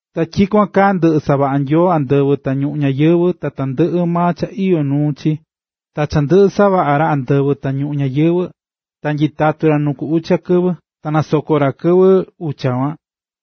Ta tyikuan kaa ndɨꞌɨ savaꞌa̱ Nyoo andɨvɨ ta ñuꞌún ñayɨvɨ̱ ta tandɨꞌɨ maa cha iyó nuu chi. Ta cha ndɨꞌɨ savaꞌa̱ ra andɨvɨ ta ñuꞌún ñayɨvɨ̱, ta nyitatu̱ ra nuu ku ucha kɨvɨ. Ta nasoko̱ ra kɨvɨ ucha kuan,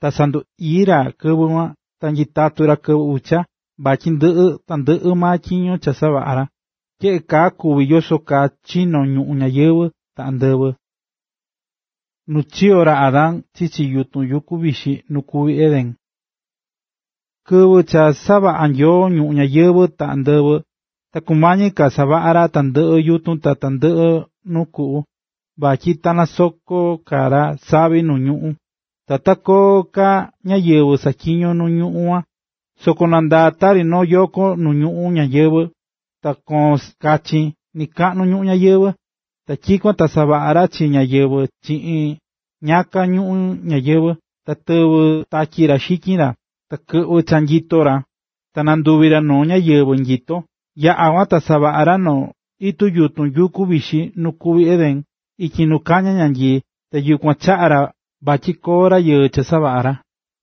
ta sandu ii̱ ra kɨvɨ kuan. Ta nyitatu̱ ra kɨvɨ ucha, vatyi ndɨꞌɨ tandɨꞌɨ maa tyiño cha savaꞌa̱ ra. Tyeꞌe kaa kuvi̱ yoso kaa chino̱ ñuꞌún ñayɨvɨ̱ ta andɨvɨ. Nu chiyo̱ ra Adán chichi yutun yukun vixi nu kuví Edén Kɨvɨ cha savaꞌa̱ Nyoo ñuꞌún ñayɨvɨ̱ ta andɨvɨ, ta kumañi ka savaꞌa ra tandɨꞌɨ yutun ta tandɨꞌɨ nuu kuꞌu, vatyi ta sakoon ka ra savi nu ñuꞌún, ta ta koo ka ñáyɨvɨ saꞌatyiñó nu ñuꞌún kuan. Soko nandaá tari noo yoko nuꞌun nu ñuꞌún ñayɨvɨ̱ ta koón kachin nɨkaꞌnu ñuꞌún ñayɨvɨ̱. Ta tyikuan ta savaꞌa̱ ra chi rayɨɨ chiꞌin ñiyaka ñuꞌún ñayɨvɨ̱, ta tɨvɨ̱ tatyi ra xityin ra, ta kɨꞌvɨ̱ cha nyito chi ra, ta nanduvi̱ ra noo ñáyɨvɨ nyito. Yaꞌa̱ kuan, ta savaꞌa̱ ra noo itu yutun yuku vixi nu kuví Edén, ityi nu kañá ñanyii, ta yukuan chaꞌa̱ ra vatyi koo rayɨɨ cha savaꞌa̱ ra.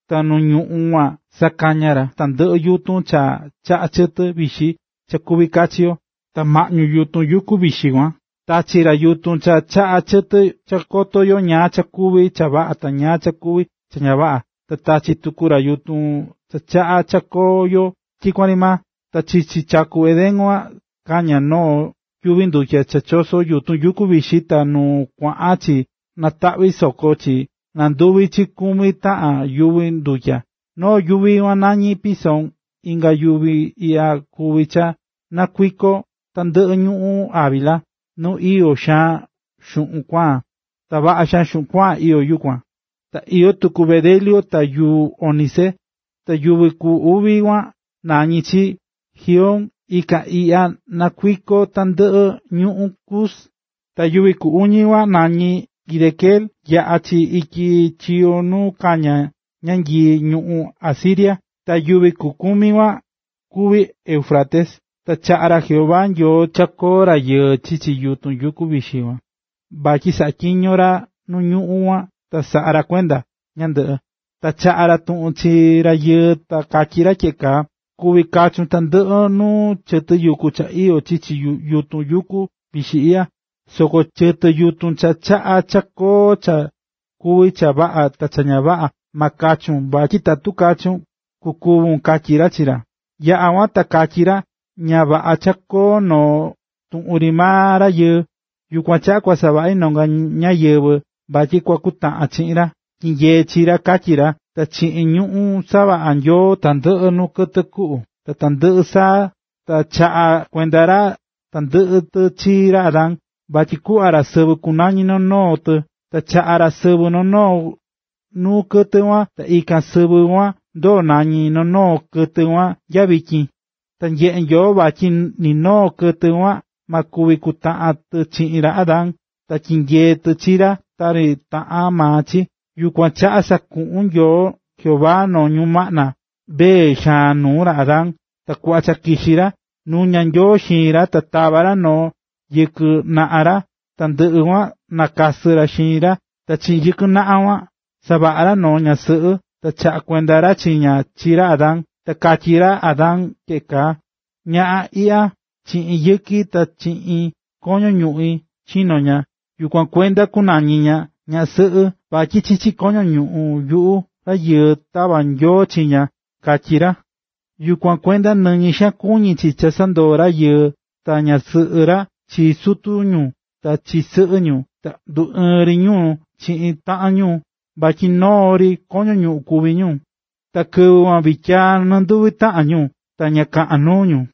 Ta nu ñuꞌún kuan sakaña̱ ra tandɨꞌɨ yutun cha chaꞌá chɨtɨ vixi cha kuví kachi yo. Ta maꞌñu yutun yuku vixi kuan, tachi̱ ra yutun cha chaꞌá chɨtɨ cha koto yo ñáá cha kuví cha vaꞌa ta ñáá cha kuví cha ña vaꞌa. Ta tachi̱ tuku ra yutun cha chaꞌá cha koo yo tyikuan ri maa. Ta chichi chaku Edén kuan kañá noo yuvi ndutya cha chosó yutun yuku vixi kuan ta nu kuaꞌan chi nataꞌví soko chi, nanduví chi kumi taꞌan yuvi ndutya. Noo yuvi kuan nañí Pisón, ikan yuvi iꞌya kuví cha nakuikó tandɨꞌɨ ñuꞌún Havila, nu iyó xaan xuꞌun kuaan. Ta vaꞌa xaan xuꞌun kuaan iyó kuan, ta iyó tuku bedelio ta yuu ónice. Ta yuvi ku uvi kuan nañí chi Gihón, ikan iꞌya nakuikó tandɨꞌɨ ñuꞌún Cus. Ta yuvi ku uñi kuan nañí Hidekel yaꞌá chi ityi chiyo nu kañá ñanyii ñuꞌún Asiria. Ta yuvi ku kumi kuan kuvi Éufrates. Ta chaꞌa̱ ra Jehová Nyoo cha koo rayɨɨ chichi yutun yuku vixi kuan, vatyi saꞌatyiño ra nu ñuꞌún kuan ta saꞌa ra kuenda ñandɨꞌɨ. Ta chaꞌa̱ ra tuꞌun chi rayɨɨ ta katyí ra tyeꞌe kaa: “Kuví kachun tandɨꞌɨ nuu chɨtɨ yutun cha iyó chichi yutun yuku vixi iꞌya, soko chɨtɨ yutun cha chaꞌá cha koton cha kuví cha vaꞌa ta cha ña vaꞌa, ma kachun, vatyi tatu kachun, kukúvun”, katyí ra chi ra. Yaꞌa̱ kuan ta katyí ra: “Ña vaꞌa cha koo noo tuꞌun ri maa rayɨɨ. Yukuan chaꞌa kua savaꞌi nonga ñáyɨvɨ vatyi kua kutaꞌan chiꞌin ra, ta tyinyee chi ra”, katyí ra. Ta chiꞌin ñuꞌún savaꞌa̱ Nyoo tandɨꞌɨ nuu kɨtɨ kuꞌu ta tandɨꞌɨ saa, ta chaꞌa̱ kuenda ra tandɨꞌɨ tɨ chi ra Adán, vatyi kuꞌva ra sɨvɨ kunañi noo noo tɨ. Ta chaꞌa̱ ra sɨvɨ noo noo nuu kɨtɨ kuan ta ikan sɨvɨ kuan ndoo̱ nañí noo noo kɨtɨ kuan nyakua nya vityin. Ta nyeꞌe̱ Nyoo vatyi ni noo kɨtɨ kuan, ma kuvi kutaꞌan tɨ chiꞌin ra Adán ta tyinyee tɨ chi ra tari taꞌan maa chi. Yukuan chaꞌa sakuꞌu̱n Nyoo Jehová noo ñumaꞌna vee xaan nuu ra Adán. Ta kuꞌva cha kixí ra, nuña̱ Nyoo xiin ra, ta tava̱ ra noo yɨkɨ naꞌan ra, ta ndɨꞌɨ kuan ta nakasɨ̱ ra xiin ra. Ta chiꞌin yɨkɨ naꞌan kuan, savaꞌa̱ ra noo ñaꞌan sɨꞌɨ, ta chaꞌa̱ kuenda ra chi ña chi ra Adán. Ta katyí ra Adán tyeꞌe kaa: “Ñaꞌan iꞌya, chiꞌin yɨki ta chiꞌin koño ñuꞌín chino̱ ña, yukuan kuenda kunañi ña “ñaꞌan sɨꞌɨ” vatyi chichi koño ñuꞌún yuꞌu rayɨɨ, tava̱ Nyoo chi ña”, katyí ra. Yukuan kuenda, nɨñɨ xaan kuñí chi cha sandoo rayɨɨ ta ñasɨꞌɨ ra chi sutu ñu ta chi sɨꞌɨ ñu, ta nduɨɨn ri ñu chiꞌin taꞌan ñu vatyi noo ri koño ñuꞌún kuví ñu. Ta kɨvɨ kuan vityiyaa nɨnduvi taꞌan ñu, ta ña kaꞌán nuu ñu.